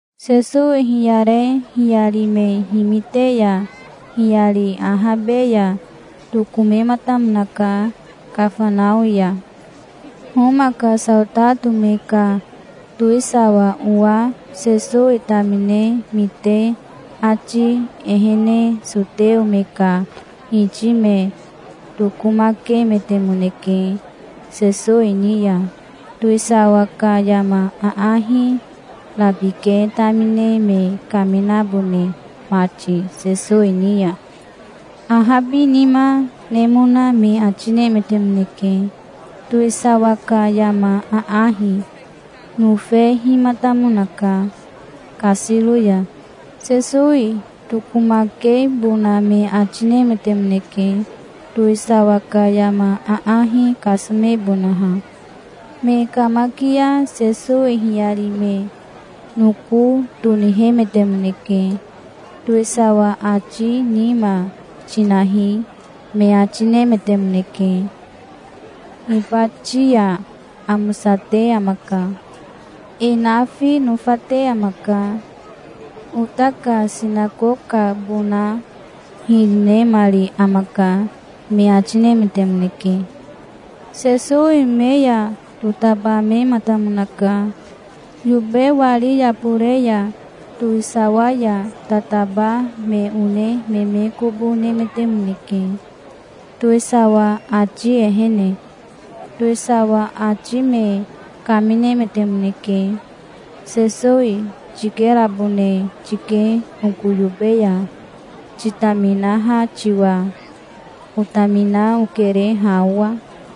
Sesowi hiyare hiyari me himite ya hiyari ahabe ya tokomematamonaka Kafanao ya. Homa ka saotato me ka towisawa owa Sesowi tamine mite ati ehene soteo me ka hiti me tokomakemetemoneke Sesowi ni ya, towisawa ka yama aahi rabike tamine me kaminabone mati Sesowi ni ya. Ahabinima nemona me ati nemetemoneke. Towisawa ka yama aahi nofehimatamonaka kasiro ya. Sesowi tokomakebona me ati nemetemoneke, towisawa ka yama aahi kasomebonaha. Me kamakia Sesowi hiyari me noko tonihemetemoneke. "Towisawa ati nima tinahi, me ati nemetemoneke. Hibati ya amosate amaka. E nafi nofate amaka. Ota ka sinakokabona hiri nemari amaka", me ati nemetemoneke. Sesowi me ya totabamematamonaka. Yobe wari yabore ya towisawa ya tataba me one me me kobo nemetemoneke, towisawa ati ehene. Towisawa ati me kaminemetemoneke. "Sesowi tikerabone tike oko yobe ya, titaminaha tiwa. Otamina okere ha owa.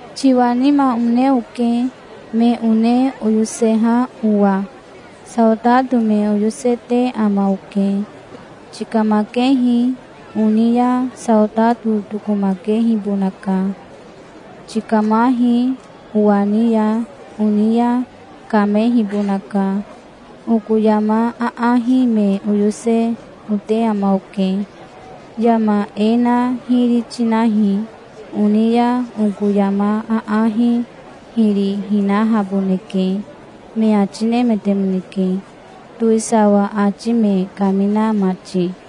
Tiwa nima one oke, me one oyoseha owa. Saotato me oyosete ama oke. 'Tikamakehi', oni ya saotato tokomakehibonaka. 'Tikamahi', owa ni ya oni ya kamehibonaka. Oko yama aahi me oyose ote ama oke. 'Yama e na hiri tinahi', oni ya oko yama aahi hiri hinahaboneke", me ati nemetemoneke towisawa ati me kamina mati.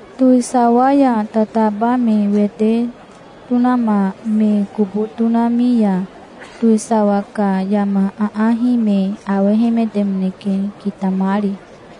Towisawa ya tataba me wete tonama me kobo tonami ya towisawa ka yama aahi me awehemetemoneke kitamari.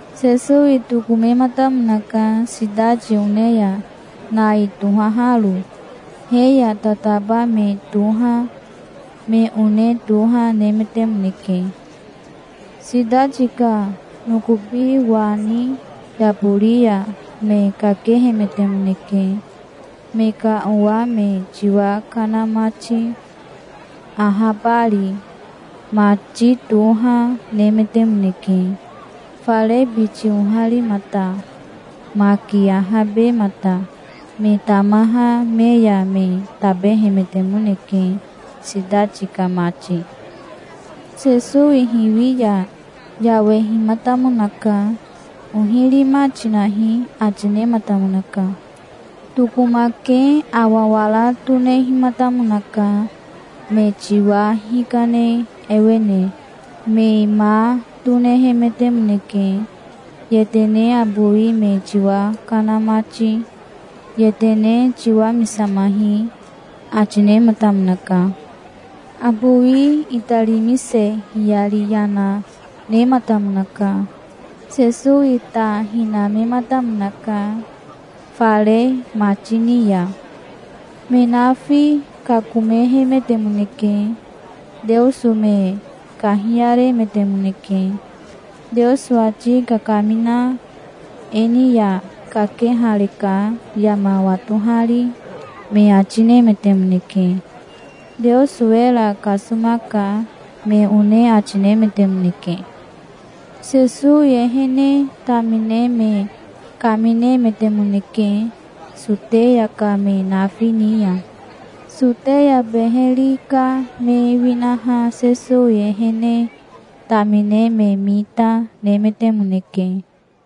Sesowi tokomematamonaka sitati one ya Nai tohaharo. He ya tataba me toha me one toha, nemetemoneke. Sitati ka nokobi wani yabori ya me kakehemetemoneke, me ka owa me tiwa kana mati, ahabari. Mati toha nemetemoneke, fare biti oharimata, maki ahabemata. Me tamaha me ya me tabehemetemoneke, sitati ka mati. Sesowi hiwi ya yawehimatamonaka. "Ohi rima tinahi", ati nematamonaka. Tokomake awa wara tonehimatamonaka, me tiwa hikane ewene. Me ma tonehemetemoneke, yetene abowi me tiwa kana mati. "Yetene tiwamisamahi", ati nematamonaka. Abowi itarimise hiyari yana nematamonaka. Sesowi ta hinamematamonaka fare mati ni ya. Me nafi kakomehemetemoneke. Teoso me kahiyaremetemoneke. "Teoso ati kakamina e ni ya kakehareka yama watohari", me ati nemetemoneke. "Teoso era kasomaka", me one ati nemetemoneke. Sesowi ehene tamine me kaminemetemoneke Soteya ka me nafi ni ya. Soteya beheri ka me winaha Sesowi ehene tamine me mita nemetemoneke.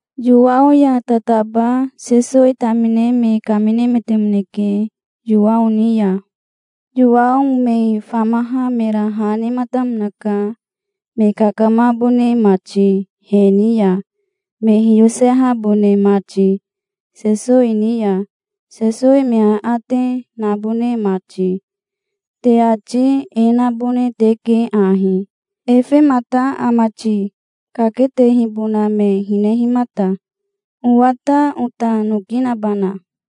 Yowao ya tataba Sesowi tamine me kaminemetemoneke Yowao ni ya. Yowao me famaha mera ha nematamonaka, me kakamabone mati he ni ya, me hiyosehabone mati Sesowi ni ya, Sesowi me aate nabone mati. "Te ati e nabone teke ahi: 'Efemata ama ti, kaketehibona me hinehimata? Owa ta ota noki nabana?'".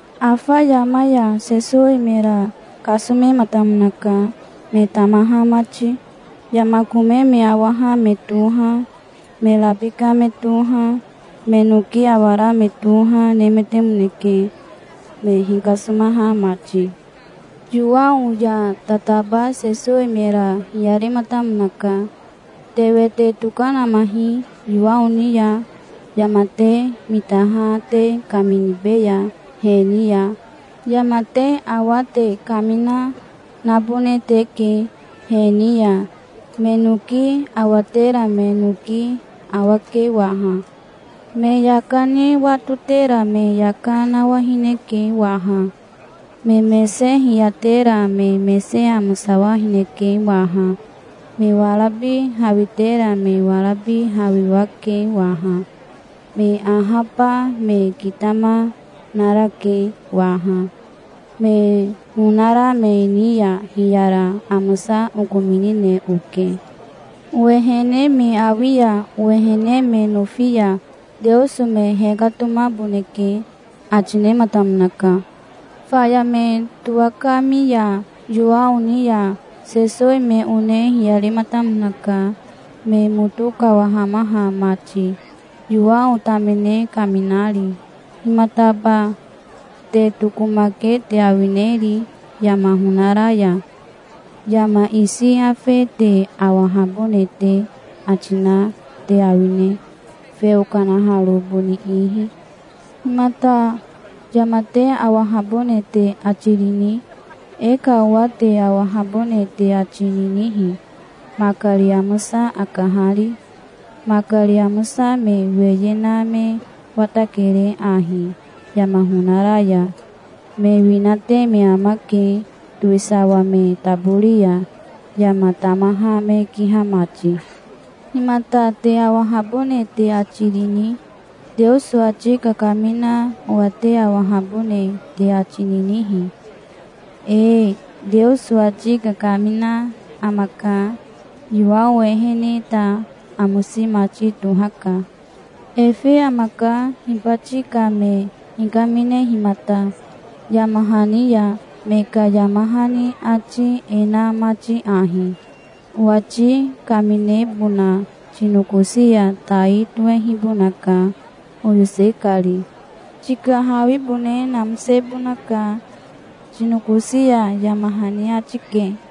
Afa yama ya Sesowi mera kasomematamonaka, me tamaha mati. Yama kome me awaha me toha, me rabika me toha, me noki awara me toha, nemetemoneke, me hikasomaha mati. Yowao ya tataba Sesowi mera hiyarematamonaka. "Te wete tokanamahi Yowao ni ya. Yama te mitaha te kaminibeya he ni ya. Yama te awa te kamina, nabone teke he ni ya. Me noki awatera me noki awake waha. Me yaka ni watotera me yaka nawahineke waha. Me mese hiyatera me mese amosawahineke waha. Me warabi hawitera me warabi hawiwake waha. Me ahaba me kitama, narake waha. Me honara me ni ya hiyara amosa okominine oke. Owehene me awi ya owehene me nofi ya Teoso me hekatomaboneke", ati nematamonaka. Faya me towakami ya Yowao ni ya, Sesowi me one hiyarematamonaka, me moto kawahamaha mati, Yowao tamine kaminari. "Himataba te tokomake te awineri yama honara ya? Yama isi afe te awahabone te ati na te awine, feo kanaharo boni ihi? Himata yama te awahabone te ati rini? E ka owa te awahabone te ati ninihi, makari amosa akahari? Makari amosa me weye na me watakere ahi yama honara ya. Me winate me amake, towisawa me tabori ya, yama tamaha me kiha mati. Himata te awahabone te ati rini? Teoso ati kakamina owa te awahabone te ati ninihi? Ee, Teoso ati kakamina amaka. Yowao ehene ta amosi mati tohaka. Efe amaka hibati ka me hikaminehimata, yama hani ya, me ka yama hani ati e na mati ahi: 'Owati kaminebona tinokosi ya tai tohehibonaka, oyose kari. Tika hawibone namosebonaka tinokosi ya', yama hani ati ke.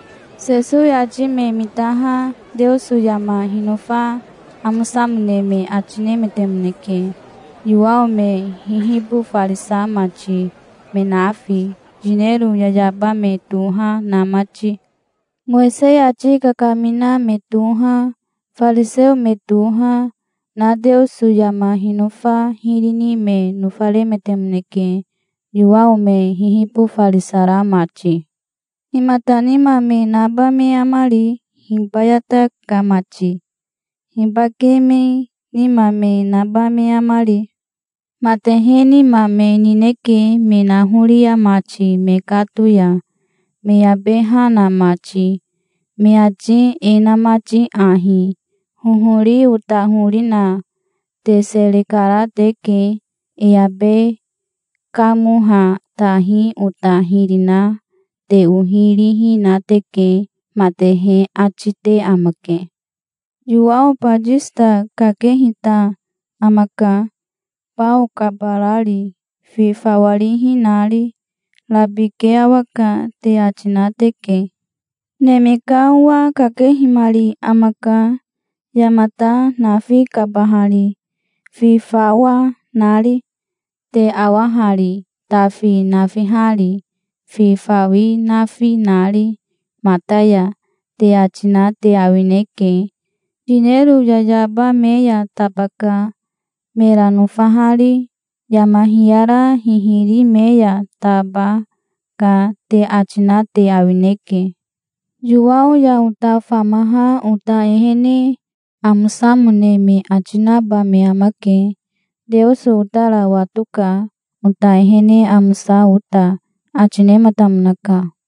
Sesowi ati me mitaha Teoso yama hinofa amosamone me ati nemetemoneke, Yowao me hihibofarisa mati, me nafi, yinero yayaba me toha na mati. Mowisei ati kakamina me toha, fariseo me toha, na Teoso yama hinofa hiri ni me nofaremetemoneke, Yowao me hihibofarisara mati. "Himata nima me naba me amari hibayata ka mati? Hibake me nima me naba me amari? Matehe nima me nineke me nahoria mati mekato ya, me abe ha na mati, me ati e na mati ahi: 'Hohori ota hori na te sere kara teke. E abe kamoha tahi ota hiri na te ohi rihi na teke', matehe ati te amake. Yowao Batisita kakehita amaka, bao kabarari, fi fawa rihi nari. 'Rabike awaka', te ati na teke. Neme ka Owa kakehimari amaka, yamata nafi kabahari, fi fawa nari. 'Te awa hari, tafi nafihari, fi fawi nafi nari mata ya', te ati na te awineke. 'Yinero yayaba me ya tabaka, mera nofahari. Yama hiyara hihiri me ya taba, ka', te ati na te awineke. Yowao ya ota famaha ota ehene amosamone me ati naba me amake. Teoso otara watoka, ota ehene amosa ota", ati nematamonaka.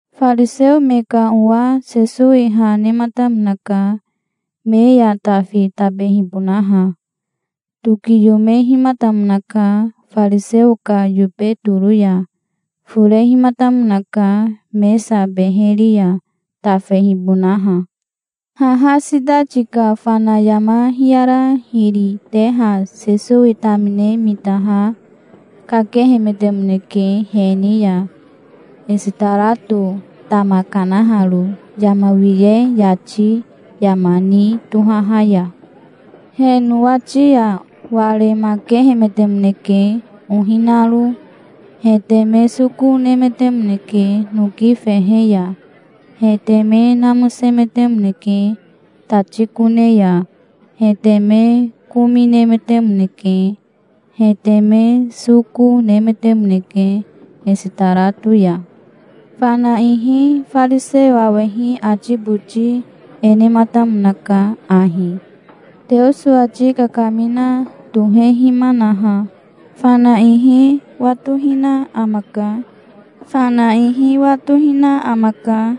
Fariseo me ka owa Sesowi ha nematamonaka, me ya tafi tabehibonaha. Tokiyomehimatamonaka fariseo ka yobe toro ya. Forehimatamonaka mesa beheri ya tafehibonaha. Haha sitati ka fana yama hiyara hiri teha Sesowi tamine mitaha kakehemetemoneke he ni ya, esitarato tama kanaharo yama wiye yati yama ni tohaha ya. He nowati ya waremakehemetemoneke ohi naro. He teme soko nemetemoneke noki fehe ya. He teme namosemetemoneke tati kone ya. He teme komi nemetemoneke. He teme soko nemetemoneke esitarato ya. Fana ihi fariseo awehi ati boti e nematamonaka ahi: "Teoso ati kakamina tohehimanaha fana ihi watohina amaka. Fana ihi watohina amaka,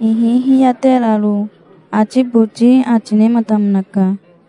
ihi hiyateraro", ati boti ati nematamonaka.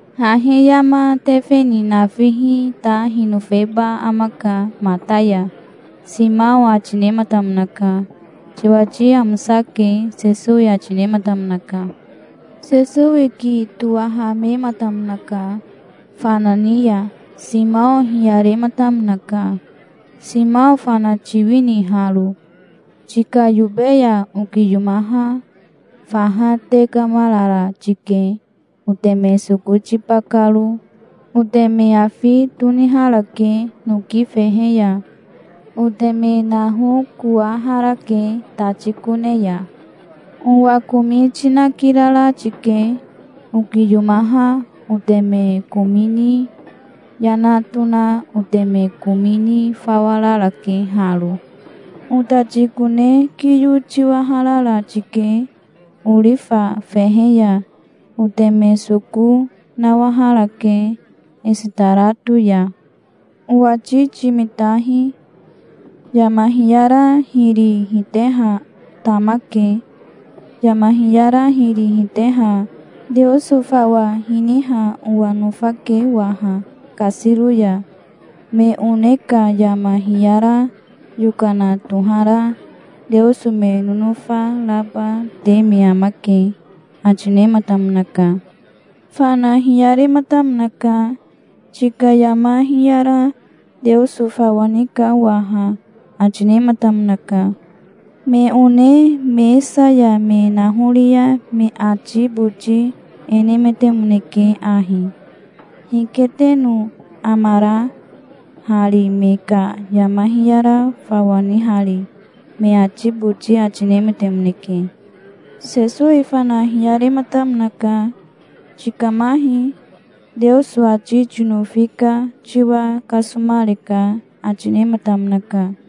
"Hahi yama tefe ni nafihi ta hinofeba amaka, mata ya", Simao ati nematamonaka. "Tiwati amosake", Sesowi ati nematamonaka. Sesowi ki towahamematamonaka fana ni ya. Simao hiyarematamonaka. "Simao fana tiwini haro? Tika yobe ya okiyomaha faha tekamarara tike oteme soko tiba karo. Oteme afi toniharake noki fehe ya. Oteme nahokowaharake tati kone ya. Owa komi tinakirara tike. Okiyomaha oteme komi ni yana tona oteme komi ni fawa rarake haro. Otati kone kiyo tiwaharara tike orifa fehe ya. Oteme soko nawaharake esitarato ya. Owati timitahi. Yama hiyara hiri hiteha tamake. Yama hiyara hiri hiteha Teoso fawa hiniha owa nofake waha kasiro ya. Me one ka yama hiyara yokana tohara Teoso me nonofa raba te me amake", ati nematamonaka. Fana hiyarematamonaka. "Tika yama hiyara Teoso fawa nika waha", ati nematamonaka. Me one mesa ya me nahoria me ati boti e nemetemoneke ahi: "Hike teno amara hari, me ka yama hiyara fawa nihari?" me ati boti ati nemetemoneke. Sesowi fana hiyarematamonaka. "Tikamahi. Teoso ati tinofi ka tiwa kasomareka", ati nematamonaka.